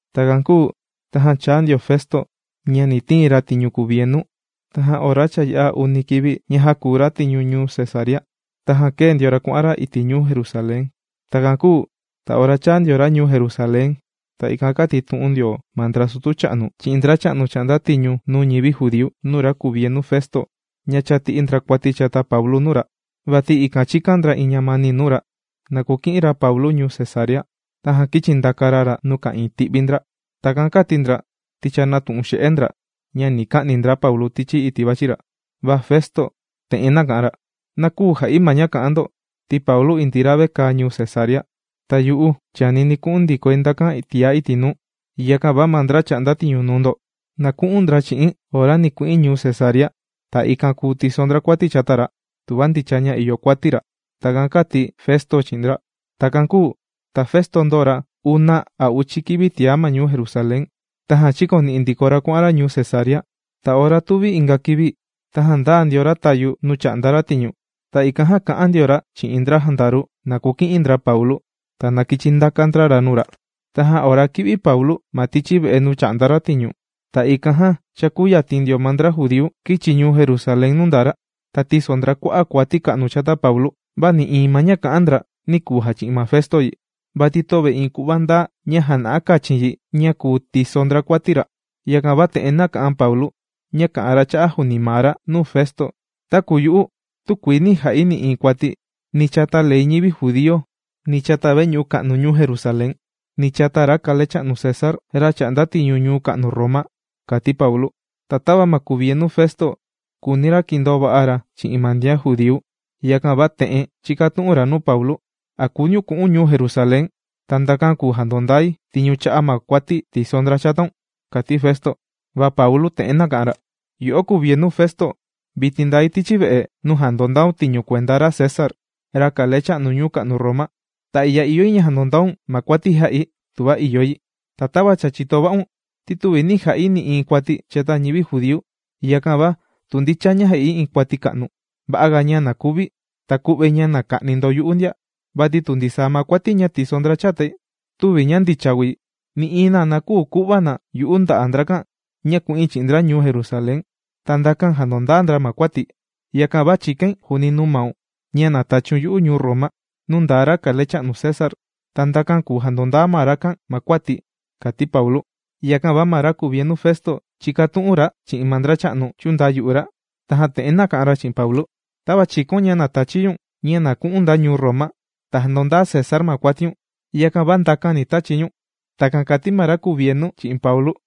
Takan kūu tajan chāa ndio Festo ña ni tiin ra tiñu kuvienu. Tajan ora cha yā'a uni kivi ña jākuu ra tiñu ñuu Cesarea, tajan kēe ndio ra kuà'an ra iti' ñuu Jerusalén. Takan kūu ta ora chāa ndio ra ñuu Jerusalén, ta ikan kātitu'un ndio ma ndra sutu cha'nu chi'in ndracha'nu chà'nda tiñu nuu ñivi judíu nuu ra kuvienu Festo ña cha tì'i ndra kuati chata Paulu nuu ra. Vati ikan chīkan ndra iin ñamani nuu ra, na kuki'in ra Paulu ñuu Cesarea, tajan kīchi ndaka ra ra nuu ka'ìin ti'vi ndra. Takan kāti ndra ti cha nātu'un xe'e ndra ña ni ka'ni ndra Paulu tichi iti' vàchi ndra. Va Festo te'en nāka'an ra: ―Na küu ja'i ma ña kà'an ndo, ti Paulu indii ra vekaa ñuu Cesarea. Ta yu'u, chànini̱ ku'un ndikoi ndakan tiá iti' nuu. Yakan va ma ndra chà'nda tiñu nuu ndo, na ku'un ndra chi'i̱n ora ni ku'in ñuu Cesarea. Ta ikan kùu tiso ndra kuati chata ra, tuva ndicha ña ìyo kuati ra. ―Takan kāti Festo chi'in ndra. Takan kūu ta Festo ndōo ra una a uchi kivi tiá ma ñuu Jerusalén. Tajan chīkoni'i ndiko ra kuà'an ra ñuu Cesarea. Ta ora tuvi inga kivi tajan ndāa ndio ra tayu nuu chà'nda ra tiñu, ta ikan jan kā'an ndio ra chi'in ndra jandaru na kuki'in ndra Paulu, ta na kichi ndaka ndra ra nuu ra. Tajan ora kī'vi Paulu ma tichi ve'e nuu chà'nda ra tiñu. Ta ikan jan cha kūyatin ndio ma ndra judíu kīchi ñuu Jerusalén nuu ndaa ra. Ta tīso ndra kua'a' kuati ka'nu chata Paulu, va nï'iin ma ña kà'an ndra nī kuu jachi'in ma Festo yi, vati töve iin ku'va ndaa ña jàna'a kachin yi ña kùu tiso ndra kuati ra. Yakan va te'en nāka'an Paulu ña kà'an ra cha'a' juuni maa ra nuu Festo: ―Taku yu'u, tükuii nī ja'i nï'iin kuati, ni chata ley ñivi judíu, ni chata veñu'u ka'nu ñuu Jerusalén, ni chata ra kalecha'nu César, ra chà'nda tiñu ñuu ka'nu Roma ―kàti Paulu. Ta tava ma kuvienu Festo, kùuni ra kindoo va'a ra chi'in ma ndian judíu, yakan va te'en chīkatu'un ra nuu Paulu: ―¿A kùuniun ku'u̱n ñuu Jerusalén, ta ndakan kùu jandondai tiñu cha'a' ma kuati tīso ndra chataun? ―kàti Festo. Va Paulu te'en nāka'an ra: ―Yo'o kuvienu Festo, vitin ndai tichi ve'e nuu jàndondaun tiñu kuenda ra César, ra kalecha'nu ñuu ka'nu Roma. Ta i'ya ìyo yi ña jandondaun ma kuati jā'i tuva ìyo yi. Ta tava cha chìto va'un, ti tüvi nī ja'i nï'iin kuati chata ñivi judíu. Yakan va tu ndicha ña jā'i iin kuati ka'nu, va'a ga ña na kuvi̱, ta ku'vai ña na ka'ni ndo yu'u ndia. Vati tu ndisaa ma kuati ña tìso ndra chatai töve ña ndicha kùu yi, nï'iin na küu ku'va na yu'u nda'a' ndrakan ña ku'in chi'in ndra ñuu Jerusalén, ta ndakan jandondaa ndra ma kuati̱. Yakan va chìkain juuni nuu maun ña na tachiun yu'u ñuu Roma nuu ndaa ra kalecha'nu César. Ta ndakan kùu jandondaa ma rakan ma kuati̱ ―kàti Paulu. Yakan va ma ra kuvienu Festo, chīkatu'un ra chi'in ma ndracha'nu chūndayu'u ra. Tajan te'en nāka'an ra chi'in Paulu: ―Tava chīkaun ña na tachi̱ ñu̱n ña na ku'u̱n nda ñuu Roma ta jandondaa César ma kuatiun, yakan va ndakan ni tachi̱ ñu̱n. ―Takan kàti ma ra kuvienu chi'in Paulu.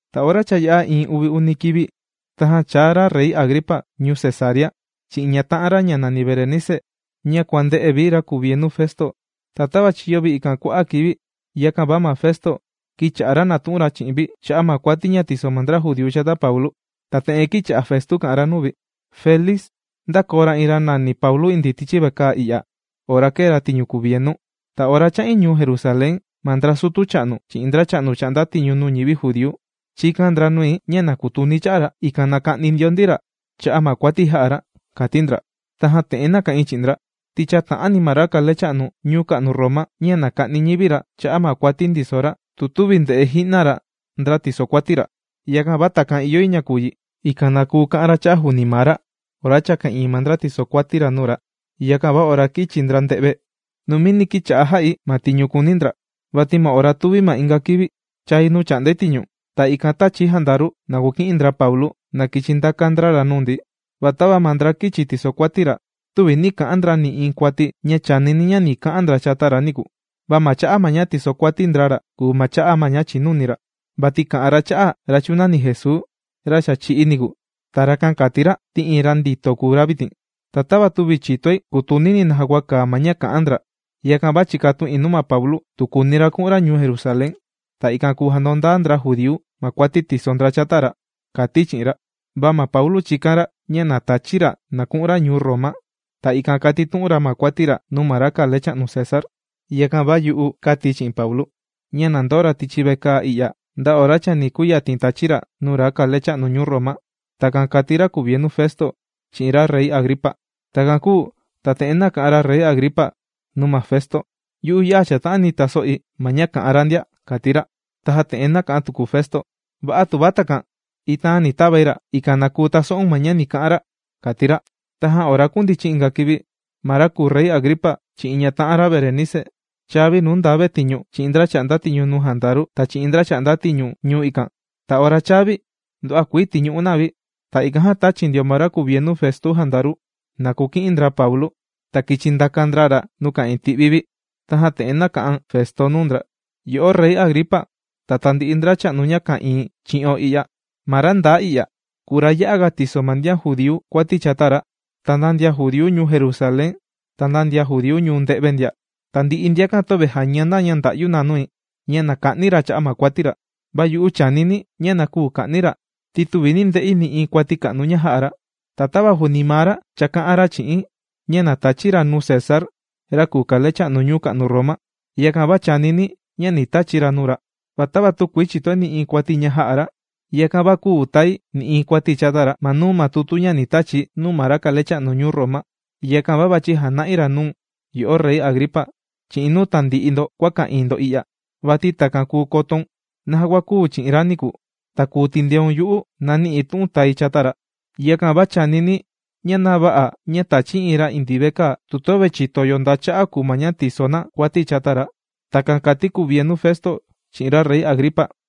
Ta ora cha yā'a iin uvi uni kivi, tajan chāa ra Rey Agripa ñuu Cesarea chi'in ñata'an ra nàni Berenice ña kuànde'e vi ra kuvienu Festo. Ta tava chīyo vi ikan kua'a' kivi, yakan va ma Festo kīcha'a ra nàtu'un ra chi'in vi cha'a' ma kuati ña tìso ma ndra judíu chata Paulu. Ta te'en kīcha'a Festo kà'an ra nuu vi: ―Félix ndākoo ra iin ra nàni Paulu indii tichi vekaa i'ya, ora kēe ra tiñu kuvienu. Ta ora chā'in ñuu Jerusalén ma ndra sutu cha'nu chi'in ndracha'nu chà'nda tiñu nuu ñivi judíu chīkan ndra nui ña na kutuni̱ cha'a ra, ikan na ka'ni ndio ndi ra cha'a' ma kuati jā'a ra, kāti ndra. Tajan te'en nāka'in chi'in ndra, ti chäta'ani ma ra kalecha'nu ñuu ka'nu Roma ña na ka'ni ñivi ra cha'a' ma kuati ndiso ra, tu tüvi ndè'e ji'na ra ndra tìsokuati ra. Yakan va takan ìyo yi ña kuu yi, ikan na kuu ka'an ra cha'a' juuni maa ra ora cha ka'ìin ma ndra tìsokuati ra nuu ra. Yakan va ora kīchi ndra nde've, numini kīcha'a jà'i ma tiñu kùuni ndra, vati ma ora tuvi ma inga kivini, chāi nuu chà'ndai tiñu, ta ikan tāchi̱ jandaru na kuki'in ndra Paulu na kīchi ndaka ndra ra nuu ndi. Va tava ma ndra kīchi tisokuati ra, tüvi nī ka'an ndra nï'iin kuati ña chànini̱ ña ni ka'an ndra chata ra niku, va ma cha'a' ña tìsokuati ndra ra kùu ma cha'a' ma ña chìnuni ra. Vati kà'an ra cha'a' ra chūnani Jesuu, ra cha chī'í niku, ta rakan kàti ra ti iin ra ndito kùu ra vitin. Ta tava tüvi chìtoi kutunini̱ naja kua kàa ma ña kà'an ndra, yakan va chīkatu'in nuu Paulu tu kùuni ra ku'un ra ñuu Jerusalén, ta ikan jandondaa ndra judíu ma kuati tìso ndra chata ra, kāti̱ chi'in ra. Va Paulu chīkan ra ña na tachi̱ ra na ku'un ra ñuu Roma, ta ikan katitu'un ra ma kuati ra nuu ma kalecha'nu César. Yakan va yu'u kāti̱ chi'in Paulu, ña na ndoo ra tichi vekaa i'ya, nda kati chani kuyatin tachi̱ ra nuu ra kalecha'nu ñuu Roma. ―Takan kàti ra kuvienu Festo chi'in ra Rey Agripa. Takan kūu ta te'en nāka'an ra Rey Agripa nuu ma Festo: ―Yu'u, ya'a chàta'ani taso'i ma ña kà'an ra ndia ―kàti ra. Tajan te'en nāka'an tuku Festo: ―Va'a tuva takan. Itaan ni tavai ra, ikan na kuu taso'un ma ña ni ka'an ra ―kàti ra. Tajan ora kūndichin inga kivi, ma ra kùu Rey Agripa chi'in ñata'an ra Berenice chāa vi nuu nda vetiñu chi'in ndra chà'nda tiñu nuu jandaru, ta chi'in ndracha'nu chà'nda tiñu ñuu ikan. Ta ora chāa vi, nduva'a kuii tīñu'u na vi. Ta ikan jan tāchi ndio ma ra kuvienu Festo jandaru, na kuki'in ndra Paulu, ta kīchi ndaka ndra ra nuu ka'ìin ti'vi vi. Tajan te'en nāka'an Festo nuu ndra: ―Yo'o Rey Agripa ta tandi'i ndracha'nu ña ka'ìin chi'o i'ya, ma ra ndaa i'ya kùu ra ya'aga tìso ma ndian judíu kuati chata ra, ta nda ndian judíu ñuu Jerusalén ta nda ndian judíu ñuu nde've ndia. Tandi'i ndiakan töve jàña na ña ndà'yu na nui ña na ka'ni̱ ra cha'a' ma kuati ra. Va yu'u chànini̱ ña na küu ka'ni̱ ra, ti tüvi nī nde'i nï'iin kuati ka'nu ña jā'a ra. Ta tava juuni maa ra cha kā'an ra chi'i̱n ña na tachi̱ ra nuu César, ra kùu kalecha'nu ñuu ka'nu Roma. Yakan va chànini̱ ña ni tachi̱ ra nuu ra. Va tava tükuii chìtoi nï'iin kuati ña jā'a ra, yakan va küu tai nï'iin kuati chata ra ma nuu ma tutu ña ni tachi̱ nuu ma ra kalecha'nu ñuu Roma. Yakan va vàchi̱ jana'i ra nuu̱n, yo'o Rey Agripa, chi'in nuu tandi'i ndo kua ka'ìin ndo i'ya. Vati takan kùu kotoun naja kua kūu chi'in ra niku, ta kùu tindeun yu'u nani'i̱ tu'un tài chata ra. Yakan va chànini̱ ña na vä'a ña tàchi̱ iin ra indii vekaa, tu töve chìto yo nda cha'a' kùu ma ña tìso na kuati chata ra. ―Takan kàti kuvienu Festo chi'in ra Rey Agripa.